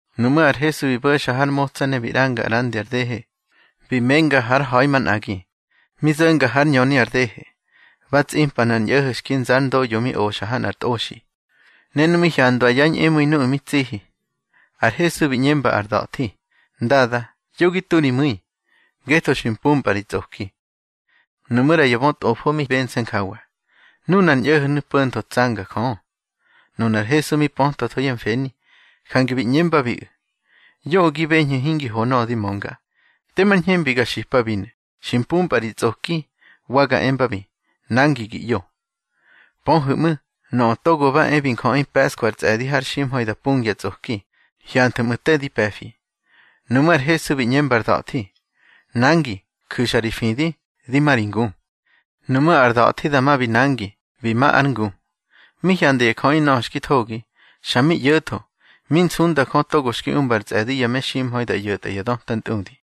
Nuꞌmú̱ ar Hesu bi bo̱xa har motsa ne bi ꞌranga ꞌrandi ar dehe, bi menga hár ha̱i manꞌagi. Mi zo̱nga hár ñöni ar dehe, ba tsꞌimpa nꞌar ñꞌo̱ho̱ xki nza ár ndoꞌyo mi oxa ha nꞌar tꞌoxi, ne nu mi hyandwa yá ñꞌemu̱i nuꞌu̱ mi tsihi, ar Hesu bi ꞌñemba ar da̱thi: —Ndada, yo gi tu ri mu̱i, ngetho xi mpumpꞌa ri tsꞌoki. Nuꞌmú̱ ꞌra ya bötꞌofo mi bense̱ njawa: Nunar ñꞌo̱ho̱nu̱ po̱ntho tsanga Jö. Nunar Hesu mi pötwatho yá mfeni, jange bi ꞌñembabiꞌu̱: —Yoꞌö gi beñhu̱ hingi ho nöꞌö di mönga. Temar ñhembi ga xipabinu̱: Xi mpumpꞌa ri tsꞌoki, wa ga embabi: Nangi gi ꞌyo. Pöhu̱ꞌmu̱, Nöꞌö Togo ba e bi Njöꞌi pe̱ꞌskwa ar tsꞌe̱di har ximha̱i da pungya tsꞌoki, hyanthu̱ꞌmu̱ te di pe̱fi. Nuꞌmú̱ ar Hesu bi ꞌñemba ar da̱thi: —Nangi, ju̱xa ri fidi, di ma ri ngu. Nuꞌmú̱ ar da̱thi dama bi nangi, bi ma ár ngu. Mi hyanda ya jöꞌi nöꞌö xki thogi, xa mi ꞌyo̱tho, mi nsundabi Jö togo xki umba ar tsꞌe̱di ya meximha̱i da ꞌyo̱tꞌa ya döta ntꞌudi.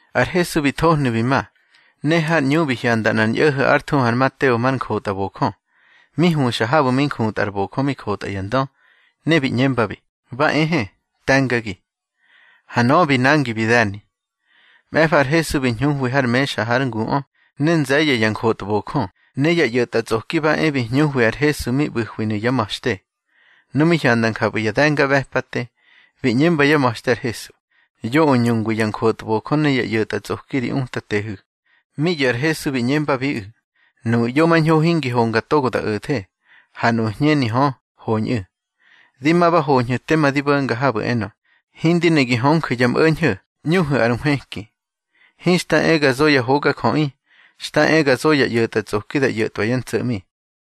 Ar Hesu bi thohnu̱ bi ma, ne har ꞌñu bi hyanda nꞌar ñꞌo̱ho̱ ár thuhu ar Mateo mar njotꞌabojö, mi huxa habu̱ mi njutꞌa ar bojö mi jotꞌa ya ndö, ne bi ꞌñembabi: —Ba ehe, te̱ngagi. Ha nöꞌö bi nangi bi de̱ni. Mꞌe̱fa ar Hesu bi hñuhwi har mexa hár nguꞌö, ne nze̱ye̱ ya njotbojö ne ya ꞌyo̱tꞌatsꞌoki ba e bi hñuhwi ar Hesu mi ꞌbu̱hwinu̱ yá ma̱xte. Nu mi hyanda njapꞌu̱ ya de̱ngaꞌbe̱pate, bi ꞌñemba yá ma̱xte ar Hesu: —Yoꞌö ñungwi ya njotbojö ne ya ꞌyo̱tꞌatsꞌoki ri Utatehu̱. Mi ꞌyo̱ ar Hesu bi ꞌñembabiꞌu̱: —Nuꞌu̱ ꞌyomañho hingi honga togo da o̱the, ha nuꞌu̱ hñeni hö, hoñꞌu̱. Di ma ba hoñhu̱ tema di bo̱nga habu̱ enö: Hindi ne gi hönju̱ ya mꞌo̱ñho̱, ꞌñuhu̱ ar nhwëki. Hinxta e ga zo ya hogajöꞌi. Xta e ga zo ya ꞌyo̱tꞌatsꞌoki da ꞌyo̱tꞌwa yá ntso̱ꞌmi.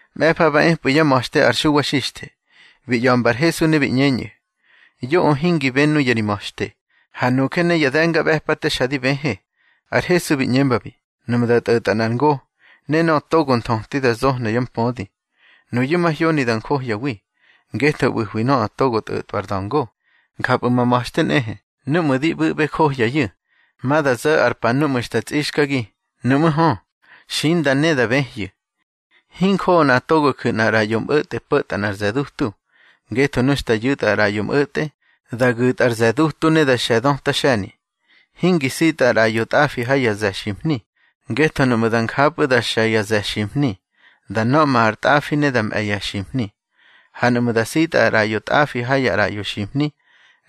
Mꞌe̱fa ba epꞌu̱ yá ma̱xte ar Xuwa Xixthe, bi ꞌya̱mba ar Hesu ne bi ꞌñeñꞌu̱: —Yoꞌö hingi bë nuya ri ma̱xte, ha nuje ne ya de̱ngaꞌbe̱pate xa di bëhë. Ar Hesu bi ꞌñembabi: —Nuꞌmu̱ da tꞌo̱tꞌa nꞌar ngo, ne nöꞌö togo bi nthöti da zohna yá mpödi, nuyu̱ mahyoni da njohyawi, ngetho ꞌbu̱hwi nöꞌö togo tꞌo̱tꞌwa ar da̱ngo. Njapꞌu̱ ma ma̱xte nꞌehe, núꞌmu̱ di ꞌbu̱ꞌbe johyayu̱. Ma da zo̱ ar pa núꞌmu̱ xta tsꞌixkagi, nuꞌmú̱ hö, xinda ne, da bëhyu̱. Hinjoꞌo nꞌa togo ju̱ nꞌar ꞌraꞌyo mꞌo̱tꞌe po̱tꞌa nꞌar ze̱ dutu, ngetho nu xta yu̱tꞌa ar ꞌraꞌyo mꞌo̱tꞌe, da gu̱tꞌa ar ze̱ dutu ne da xe̱ döta xe̱ni. Hingi sitꞌa ar ꞌraꞌyo tꞌafi ha ya ze̱ ximhni, ngetho nuꞌmu̱ da njapꞌu̱ da xe̱ ya ze̱ ximhni, da nöꞌma ar tꞌafi ne da mꞌe̱ ya ximhni. Ha nuꞌmu̱ da sitꞌa ar ꞌraꞌyo tꞌafi ha ya ꞌraꞌyo ximhni,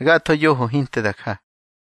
gatho yoho hinte da ja.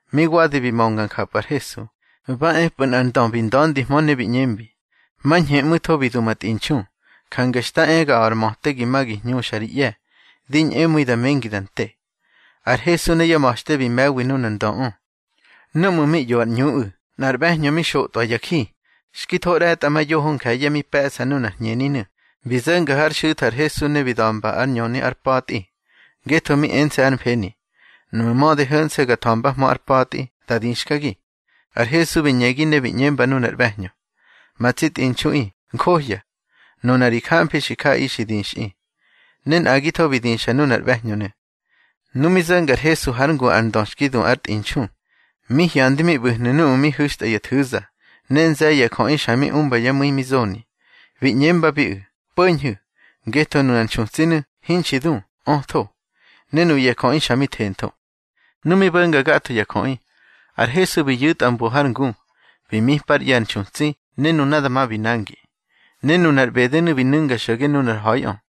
Mi wadi bi mönga njapꞌu̱ ar Hesu, ba epꞌu̱ nꞌar ndö bi nda̱ndihmö ne bi ꞌñembi: —Mañhemꞌu̱tho bi du ma tꞌinxu, jange xta e ga a̱ꞌar möte gi ma gi hñuxa ri ꞌye̱; di ñꞌemu̱i da mengi da nte. Har Hesu ne yá ma̱xte bi me̱wi nunar ndöꞌö. Núꞌmu̱ mi ꞌyo ar ꞌñuꞌu̱, nꞌar ꞌbe̱hñö mi xotꞌwa ya ji, xki tho ꞌre̱tꞌamayoho nje̱ye̱ mi pe̱ꞌsa nunar hñeninu̱, bi zo̱nga hár xu̱tha ar Hesu ne bi da̱mba ár ñöni ár pa̱tꞌi. Ngetho mi ense̱ hár mfeni: Nuꞌmu̱ mödi ho̱nse̱ ga tha̱mbahmö ár pa̱tꞌi, da dixkagi. Ar Hesu bi ñegi ne bi ꞌñemba nunar ꞌbe̱hñö: —Ma tsi tꞌinxuꞌi, njohya. Nuna ri jamfi xi jaꞌaꞌi xi dixꞌi. Ne nꞌagitho bi dixa nunar ꞌbe̱hñönu̱. Nu mi zo̱nga ar Hesu hár ngu ar ndö xki du ár tꞌinxu, mi hyandi mi ꞌbu̱hnu̱ nuꞌu̱ mi hu̱xtꞌa ya nthu̱za, ne nze̱ye̱ ya jöꞌi xa mi umba yá mu̱i mi zoni. Bi ꞌñembabiꞌu̱: —Po̱ñhu̱, ngetho nunar nxutsinu̱, hinxi du, ötho. Ne nuya jöꞌi xa mi thentho. Nu mi bo̱nga gatho ya jöꞌi, ar Hesu bi yu̱tꞌa mbo har ngu, bi mipa ár ꞌye̱ ar nxutsi, ne nuna dama bi nangi. Ne nunar ꞌbedenu̱ bi nu̱nga xo̱ge nunar ha̱iꞌö.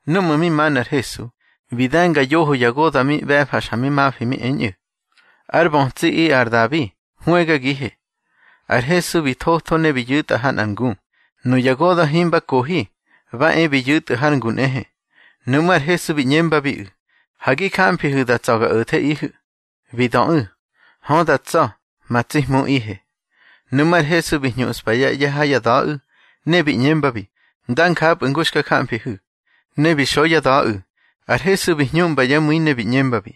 Núꞌmu̱ mi manu̱ ar Hesu, bi de̱nga yoho ya goda̱ mi ꞌbe̱fa xa mi mafi mi eñꞌu̱: —Ár bötsiꞌi ar Dabi, hwëgagihe. Ar Hesu bi thotho ne bi yu̱tꞌa ha nꞌar ngu. Nuya goda̱ himba kohi, ba e bi yu̱tꞌu̱ har ngu nꞌehe. Nuꞌmú̱ ar Hesu bi ꞌñembabiꞌu̱: —Ha gi jamfihu̱ da tsa̱ ga o̱theꞌihu̱. Bi döꞌu̱: —Hö da tsa̱, ma tsi Hmuꞌihe. Nuꞌmú̱ ar Hesu bi hñuꞌspa yá ꞌye̱ ha yá da̱ꞌu̱, ne bi ꞌñembabi: —Dá njapꞌu̱ ngu xka jamfihu̱. Ne bi xo yá da̱ꞌu̱. Ar Hesu bi hñuꞌmba yá mu̱i ne bi ꞌñembabi: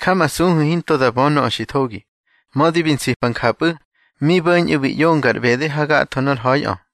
—Jamasuhu̱ hinto da bö nöꞌö xi thogi. Mödi bi nsipa njapꞌu̱, mi bo̱ñꞌu̱ bi ꞌyonga ar ꞌbede hagatho nor ha̱iꞌö.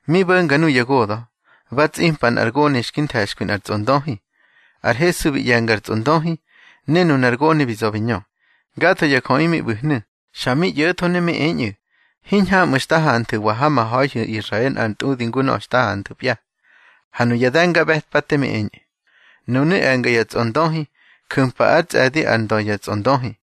Mi bo̱nga nuya goda̱, ba tsꞌimpa nꞌar gone xki nthe̱xkwi nꞌar tsꞌondöhi. Ar Hesu bi ꞌye̱nga ar tsꞌondöhi, ne nunar gone bi za̱ bi ñö. Gatho ya jöꞌi mi ꞌbu̱hnu̱, xa mi ꞌyo̱tho ne mi eñꞌu̱: —Hiñhamꞌu̱ xta hanthu̱wa ha ma ha̱ihu̱ Israel nꞌar ntꞌudi ngu nöꞌö xta hanthu̱pya. Ha nuya de̱ngaꞌbe̱pate mi eñꞌu̱: —Nunu̱ e̱nga ya tsꞌondöhi, ju̱mpa ár tsꞌe̱di ár ndö ya tsꞌondöhi.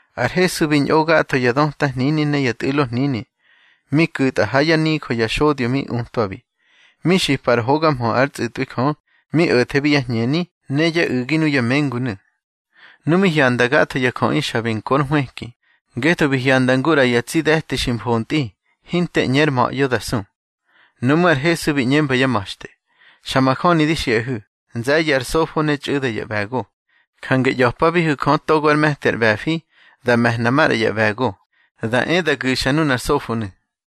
Ar Hesu bi ñꞌo gatho ya döta hnini ne ya tꞌu̱lo hnini, mi ku̱tꞌa ha yá nijö ya xodyo mi utwabi, mi xipa ár hoga mhö ár tsꞌu̱tꞌwi Jö, mi o̱thebi yá hñeni ne yá u̱gi nuya mengunu̱. Nu mi hyanda gatho ya jöꞌi xa bi nkor nhwëki, ngetho bi hyanda ngu ꞌra ya tsi de̱ti xi mfontꞌi, hinte ꞌñe ár ma̱ꞌyo da su. Nuꞌmú̱ ar Hesu bi ꞌñemba yá ma̱xte: —Xa majöni di xiꞌahu̱, nze̱ye̱ ar sofo ne txꞌu̱da ya ꞌbe̱go. Jange ꞌya̱pabihu̱ Jö togo ár me̱ti ar ꞌbe̱fi, da me̱hna maꞌra ya ꞌbe̱go, da e da gu̱xa nunar sofonu̱.